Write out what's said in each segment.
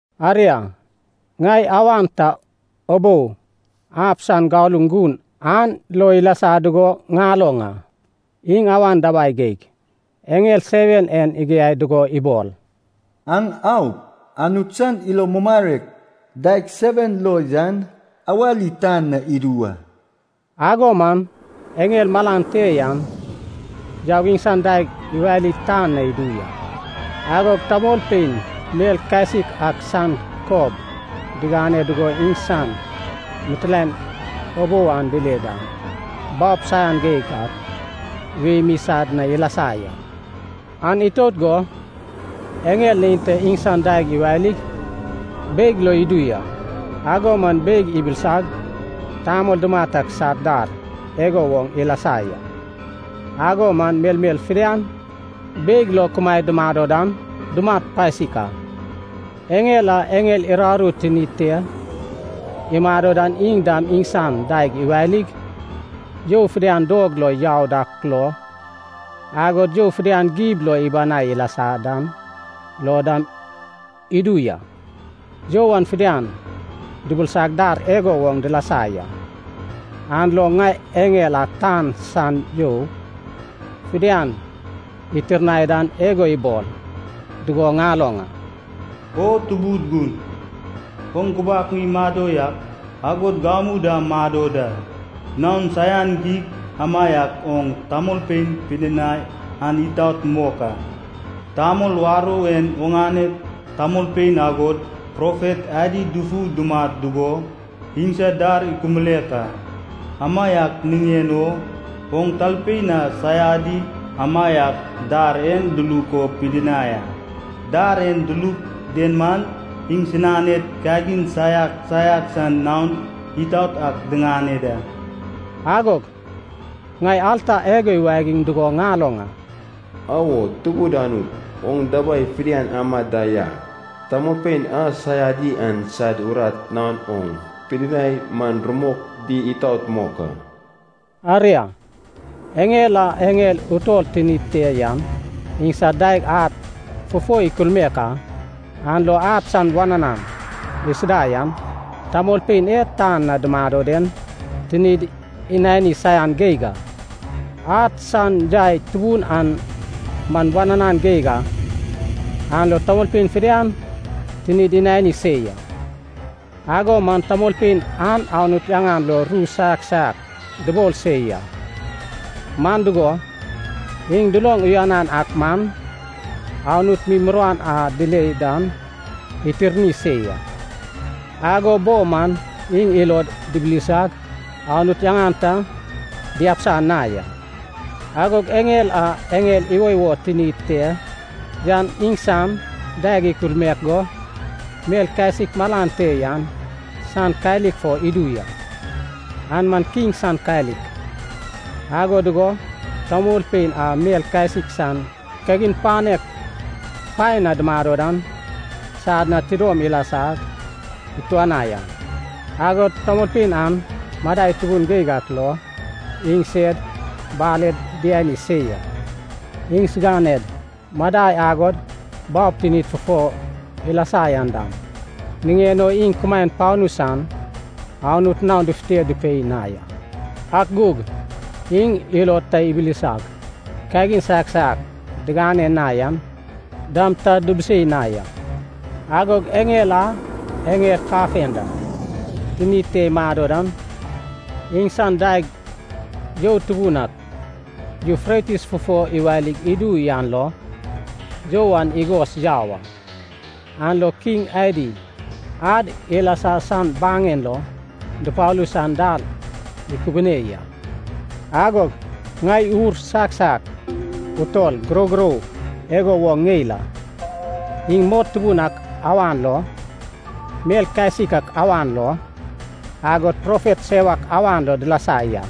Aria, ŋai awan ta ubou ab san galuŋ gun an lo ilasa dugo ŋaloŋ a. Iŋ awan dabai geig eŋel seven en igiai dugo ibol, “Aŋ aup, Anut san ilo mumarek daeg seven lo yan awali tan na idu wa.” Ago man eŋel malan te yan yaug iŋsan daeg iwali tan na idu ya. Agog tamolpein mel kasik ak san kob diŋane dugo iŋsan mitilaen ubou an dile dan, baob saian geig ak wei mi sad na ilasa ya. An itout go eŋel neinta iŋsan daeg iwalig beig lo idu ya. Ago man beig ibilisag, tamol dumat ak sad dar igo woŋ ilasa ya. Ago man melmel fidian beig lo kumaed dumado dan dumat pasik a. Eŋel a eŋel uraru tinid te imado dan iŋ dam iŋsan daeg iwalig, you fidian dog lo yau dak lo, agod you fidian gib lo ibanai ilasa dan lo dam idu ya. You an fidian dubilisag dar igo woŋ dilasa ya. An lo ŋai eŋel a tan san you fidian itirnai dan igo ibol dugo ŋaloŋ a. “O Tubud Gun, oŋ gubak mi mado yak, agod gamu dam mado da. Naon saian geig amaiak oŋ tamolpein pidinai an itaot mok a. Tamol warou en oŋane tamolpein agod profet adi dufu dumat dugo, iŋsad dar ikulmaek a. Amaiak niŋen o oŋ talpein a saiadi amaiak dar en duluk o pidinai a. Dar e duluk den man, iŋsiganed kagin saiak saiak san naon itaot ak diŋane da.” Agog ŋai alta igo iwagiŋ dugo ŋaloŋ a. “Awo Tubud Anut, oŋ dabai fidian ama da ya. Tamolpein a saiadi an sad urat naon oŋ pidinai man rumok di itaot mok a.” Aria, eŋel a eŋel utol tinid te yan iŋsan daeg ad fufo ikulmaek a. An lo ad san wananan isida yan, tamolpein e tan na dumado den tinid inani saian geig a. Ad san yai tubun an man wananan geig a, an lo tamolpein fidian tinid inani se ya. Ago man tamolpein an Anut yaŋan lo ru saiak saiak dubol se ya, man dugo, iŋ duloŋ uyanan ak man, Anut mi muruan a dile dan itirni se ya. Ago bo man iŋ ilod dibilsag Anut yaŋan ta diabisa na ya. Agog eŋel a eŋel iwoiwo tinid te yan iŋsan daeg ikulmaek go, mel kasik malan te yan san kalik fo idu ya, an man kiŋ san kalik. Ago dugo tamolpein a mel kasik san kagin panek paen na dumado dan, sad na tidom ilasag ituanai a. Agod tamolpein an madai tubun geig ak lo iŋsed baled diani se ya. Iŋsiganed madai agod baob tinid fufo ilasa yan dam niŋen o iŋ kumaen panu san Anut naon dufute dupei na ya. Ak gug iŋ ilod ta ibilisag, kagin saiak saiak digane na yan dam ta dubusei na ya. Agog eŋel a eŋel kafenda tinid te imado dan, iŋsan daeg you tubun ak Yufretis fufo iwalig idu yan lo, you an igos yau a. An lo kiŋ adi ad ilasa san baŋen lo dupalu san dal ikubune ya. Agog ŋai ur saiak saiak utol gurogurou igo woŋ ŋeil a. Iŋ mot tubun ak awan lo, mel kasik ak awan lo, agod profet sewak awan lo dilasa ya.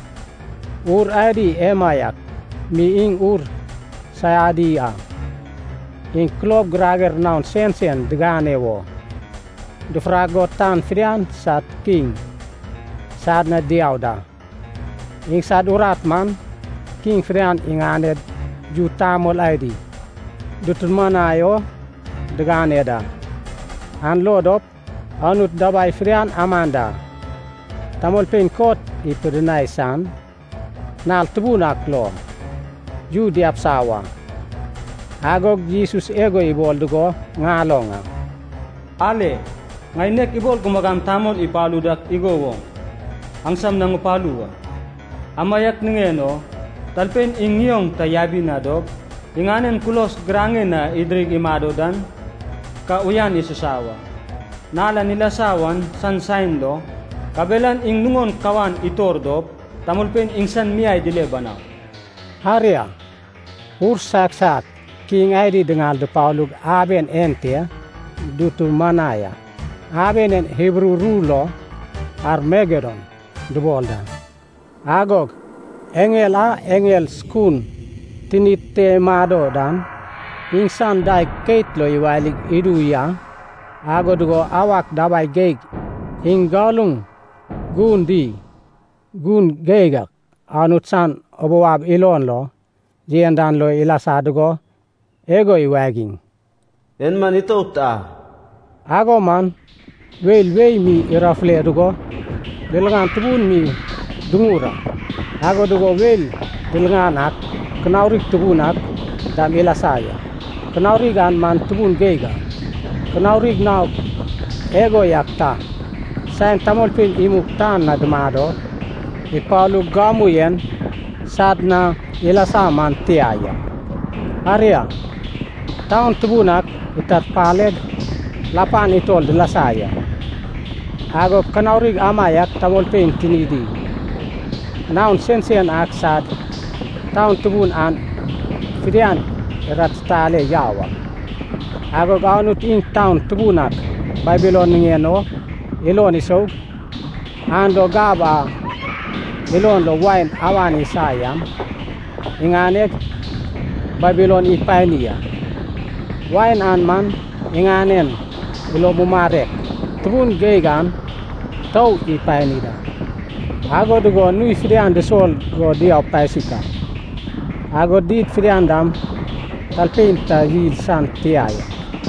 Ur adi emaiak mi iŋ ur saiadi a. Iŋ kulob girager naon sensen digane wo, dufurak go tan fidian sad kiŋ sad na diau da. Iŋsad urat man, kiŋ fidian iŋaned yu tamol adi dutumanai o digane da, an lo dop Anut dabai fidian aman da tamolpein kot ipidinai san nal tubun ak lo, yu diabisa wa. Agog Jesus igo ibol dugo ŋaloŋ a, “Ale. Ŋai nek ibol gumagam tamol ipalu dak igo woŋ, aŋsam na ŋupalu wa. Amaiak niŋen o talpein iŋ ŋioŋ ta yabi na dop, iŋanen kulos giraŋen na idirig imado dan, ka uyan isusa wa. Nal a ilasa wan san saen lo, kabelan iŋ nuŋon kawan itor dop tamolpein iŋsan miai dile banau.” Aria, ur saiak saiak kiŋ adi diŋal dupalug aben ente dutumanai a. Aben en Hibru ru lo Armagedon dubol da. Agog eŋel a eŋel sukun tinid te imado dan, iŋsan daeg keit lo iwalig idu ya. Ago dugo awak dabai geig iŋ galuŋ gun di gun geig ak Anut san ubou ab ilon lo yen dan lo ilasa dugo igo iwagiŋ, “En man itout a!” Ago man weil wei mi irafule dugo, liliŋan tubun mi duŋur a, ago dugo weil diliŋan ak, kanaurig tubun ak dam ilasa ya. Kanaurig an man tubun geig a, kanaurig naok igo yak ta, saen tamolpein imug tan na dumado ipalug gamu yen sad na ilasa man tia ya. Aria, taun tubun ak itarpaleg lapan utol dilasa ya. Agod kanaurig amaiak tamolpein tinidi naon sensen ak sad taun tubun an fidian iratitale yau a. Agod Anut iŋ taun tubun ak Babilon niŋen o ilon isoug, an lo gab a ilon lo wain awan isa yan iŋaneg Babilon ipani a. Wain an man iŋanen ilo mumarek tubun geig an tou ipani da. Ago dugo nui fidian dusol go diau pasik a. Agod did fidian dam talpein ta yil san tia ya.